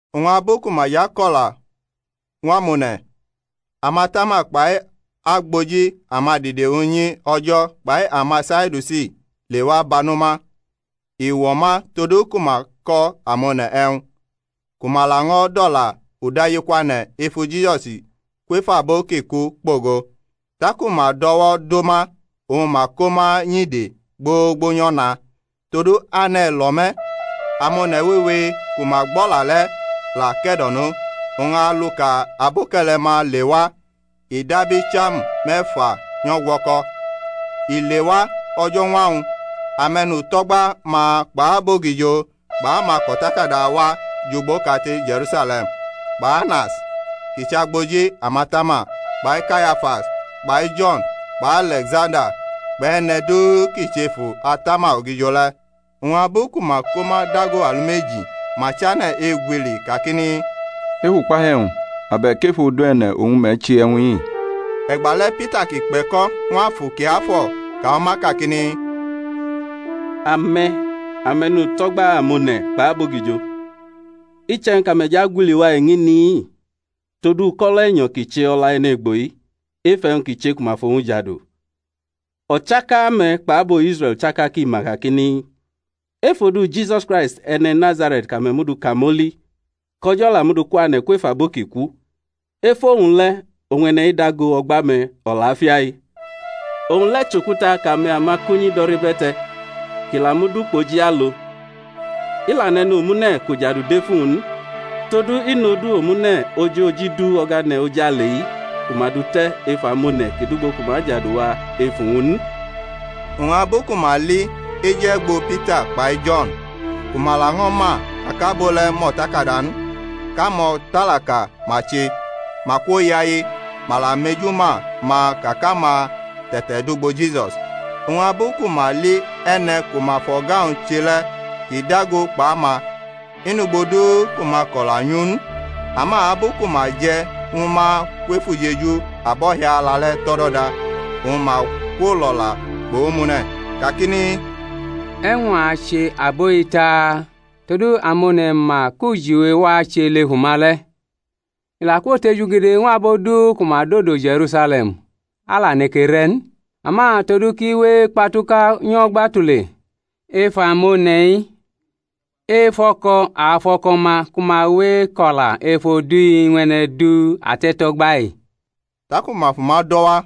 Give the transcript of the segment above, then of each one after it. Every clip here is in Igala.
Oñ abu ku ma jʼako̩la ñw amone̩, amatama kpai agboji amadide unyi O̩jo̩ kpai amaSadiusi lewa bano ma, i wo̩ ma todu ku ma ko̩ amone̩ e̩wñ, ku ma laño̩ dʼo̩la udajikwane̩ efu Jisusi kwef abo ki ku kpogo. Taku ma dʼo̩wo̩ do ma oñ ma ko ma nyʼide gbogbo nyʼo̩na: todu ane̩ lo̩ me̩. Amone̩ wewe kuma gbʼo̩la le̩ la ke̩do̩no: oñ aluka aboke̩le̩-ma lewa i dab icham me̩fa nyʼo̩gwo̩ko̩. I lewa, o̩jo̩ñwa-wñ, ame̩nuto̩gba-ma kpʼabogijo kpʼamako̩takada wa jʼugbo kate Je̩rusale̩m; kpʼAnas, kʼi chʼagboji amatama, kpai Kayafas kpai Jo̩n kpʼAle̩ksanda kpʼe̩ne̩ du ki chʼefu atama ogijo le̩. Oñ abu ku ma ko ma dago alumeji ma chane̩ egwili kakini, Ef ukpahiu e̩wñ, abe̩k ef odu e̩ne̩ oñ me̩ che e̩wñ-i? E̩gbale̩ Pita kʼi kpe̩ko̩ ñw Afu Kiafo̩ ka ñw ma kakini, Ame̩, ame̩nuto̩gba amone̩ kpʼabogijo, iche̩wñ kʼame̩ jʼagwili wa eñini-i tod uko̩lo̩ e̩nyo̩ ki che o̩la e̩ne̩gbo-i, ef e̩wñ ki che ku ma fʼowñ jadu; o̩chaka-me̩ kpʼabo Israe̩l chaka ki ma kakini, Ef odu Jisusi Kraisti e̩ne̩ Nazare̩t kʼame̩ mʼu du kamoli, kʼO̩jo̩ la mʼu du kwane̩ kwef abo ki ku, ef owñ le̩ oñ e̩ne̩-i dago o̩gba-me̩ o̩lafia-i. Owñ le̩ chʼokuta kʼame̩ amakunyi do̩rʼibe̩te̩ kʼi la mud ukpoji alo. I la nʼe̩nomune̩ kʼujadu dʼef uwñ n; todu i nʼodu omune̩ ojoji du o̩gane̩ ojale-i ku ma dʼu te̩ ef amone̩ ki dʼugbo ku ma ajadu wa ef uwñ n. Oñ abu ku ma li eju-e̩gbo Pita kpai Jo̩n, ku ma laño̩ ma ka kʼabo le̩ mʼo̩takada n kʼamo̩talaka ma che, ma kwoyaye; ma la mejuma ma ka kʼama te̩tedʼugbo Jisus. Oñ abu ku ma li e̩ne̩ ku ma fʼo̩ga-wñ che le̩ kʼi dago kpʼama, i nʼugbo du ku ma ako̩la nyʼu n. Ama abu ku ma je̩ ñw ma kwʼef ujeju abo̩hiala le̩ tʼo̩do̩da, oñ ma kwolo̩la kpʼomune̩, kakini, E̩wñ a ache abo-i taa? todu Amone̩ ma ka kʼujiwe wache lʼef uma le̩, i la kwotejugede ñw abo du ku ma dodo Je̩rusale̩m; a la neke re̩ n. Ama todu kʼi we ekpatuka nyo̩gba tule ef amone̩-i, efo̩ko̩ a afo̩ko̩ ma ku ma we eko̩la ef odu-i ñw e̩ne̩ du ate̩to̩gba-i. Taku ma fʼuma do̩ wa,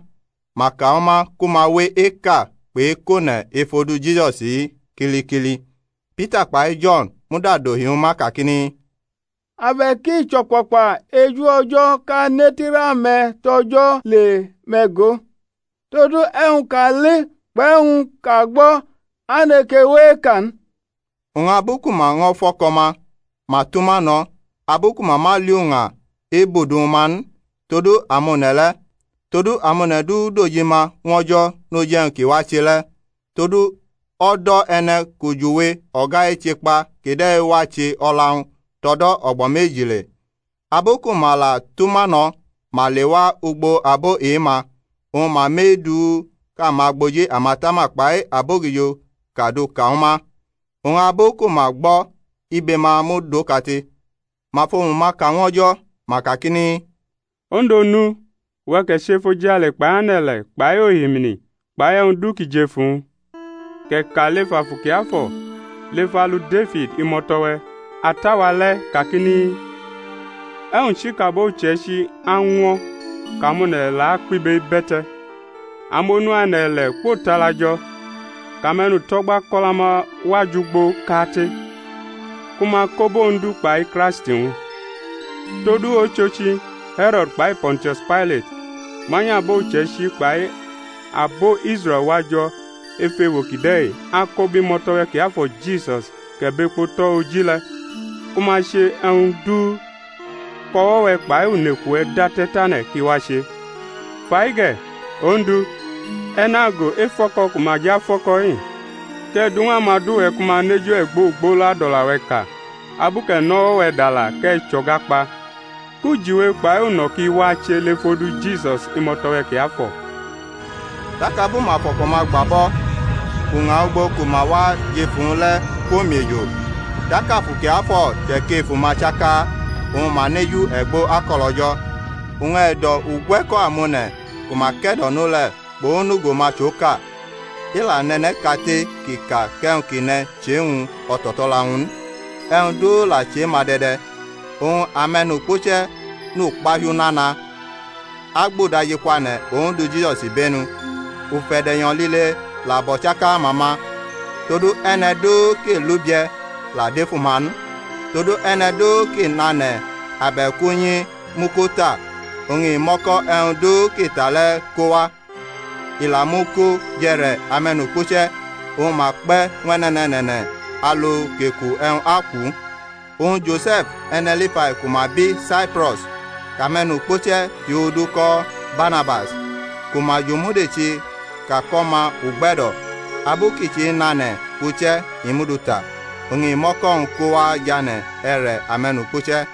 ma ka ñw ma ku ma we eka kpʼekʼone̩ ef odu Jisusi-i kilikili. Pita kpai Jo̩n muda dohi ñw ma kakini, Abe̩k i chʼo̩kpakpa eju O̩jo̩ kʼa netirʼame̩ tʼO̩jo̩ le, me̩ go! todu e̩wñ kʼa li kpʼe̩wñ kʼa gbo̩ a neke we eka n. Oñ abu ku ma ño̩ fo̩ko̩ ma, ma tʼuma no̩, abu ku ma ma li uña ebʼudu ñw ma n, todu amone̩ le̩; todu amone̩ du dojima ñw O̩jo̩ noj e̩wñ ki wache le̩. Todu o̩do̩ e̩ne̩ kʼujiwe o̩ga eche kpa kide̩ wa che o̩la-wñ tʼo̩do̩ o̩gbo̩ meji le. Abu ku ma la tʼuma no̩ ma lewa ugbo abo e-ma, oñ ma mʼe-du kʼamagboji amatama kpai abogijo ka duka ñwu ma. Oñ abu ku ma gbo̩ ibe-ma mud okate, ma fʼomu-ma ka ñw O̩jo̩, ma kakini, Ondu Onu, uwe̩ kʼe̩ che efojale kpai ane̩-ile̩ kpai ohimini kpai e̩wñ du ki jʼef uwñ: kʼe̩ ka lef Afu Kiafo̩ lef alu Defid, imo̩to̩-we̩ ata-wa le̩, kakini, E̩wñ chi kʼabo uche̩ichi añwo̩ kʼamone̩ la kpʼibe ibe̩te̩? Amonu ane̩-ile̩ kwotala jo̩, kʼame̩nuto̩gba kʼo̩la-ma wa jʼugboʼkate ku ma kobʼOndu kpai Kraisti-wñ. Todu ochochi, He̩ro̩d kpai Po̩ntius Pailat manyʼabo uche̩ichi kpai abo Israe̩l wajo̩ ef ewo kide̩-i ako bʼimo̩to̩-we̩ kiafo̩ Jisus kʼe̩ bʼekpo tʼo̩ oji le, ku ma che e̩wñ du kʼo̩wo̩-we̩ kpai uneku-we̩ date̩ tane̩ kʼi wache. Fai ge̩, Ondu, e̩ nago efo̩ko̩ ku ma jʼafo̩ko̩-i, kʼe̩ du ñw amadu-we̩ ku ma nʼeju e̩gbo ogbolo adʼo̩la-we̩ ka, abu kʼe̩ nʼo̩wo̩-we̩ dala kʼe̩ chʼo̩ga kpa; kʼujiwe kpai uno̩ ki wa che lef odu Jisus, imo̩to̩-we̩ kiafo̩. Tak abu ma fʼo̩ko̩-ma gba bʼo̩, uña ugbo ku ma wa jʼef uwñ le̩ kwomiejo; tak Afu Kiafo̩ che̩kʼef uma chaka, oñ ma nʼeju e̩gbo akʼo̩lO̩jo̩. Oñ e̩do̩ ugwe̩ko̩ amone̩ ku ma ke̩do̩no le̩ kpʼonugo-ma chʼoka; i la nʼe̩ne̩ kate kʼi ka kʼe̩wñ kʼi ne̩ chʼe-wñ o̩to̩to̩la-wñ n; e̩wñ du la chʼe-ma de̩de̩. Oñ ame̩nukpuche̩ nʼukpahiu nana agbʼudajikwane̩ Ondu Jisus ibenu; ufe̩de̩nyo̩ liie la bʼo̩chaka-ma ma. Todu e̩ne̩ du ki Iʼubie̩ la dʼef uma n: todu e̩ne̩ du kʼi nʼane̩ abe̩k unyi mʼu ko ta, oñ i mʼo̩ko̩ e̩wñ du kʼi ta le̩ ko wa, i la mʼu ko jʼe̩re̩ ame̩nukpuche̩, oñ ma kpe̩ ñw e̩ne̩ne̩ne̩ne̩ alu kʼeku e̩wñ akwʼu. Oñ Jose̩f, e̩ne̩ Lifai ku ma bi Saipro̩s, kʼame̩nukpuche̩ hiodu ko Barnabas (ku ma jomudechi ka kʼO̩ma Ugbe̩do̩) abu kʼi chenʼane̩ uche̩ i mʼu du ta, oñ i mʼo̩ko̩-wñ ko wa jʼane̩ e̩re̩ ame̩nukpuche̩.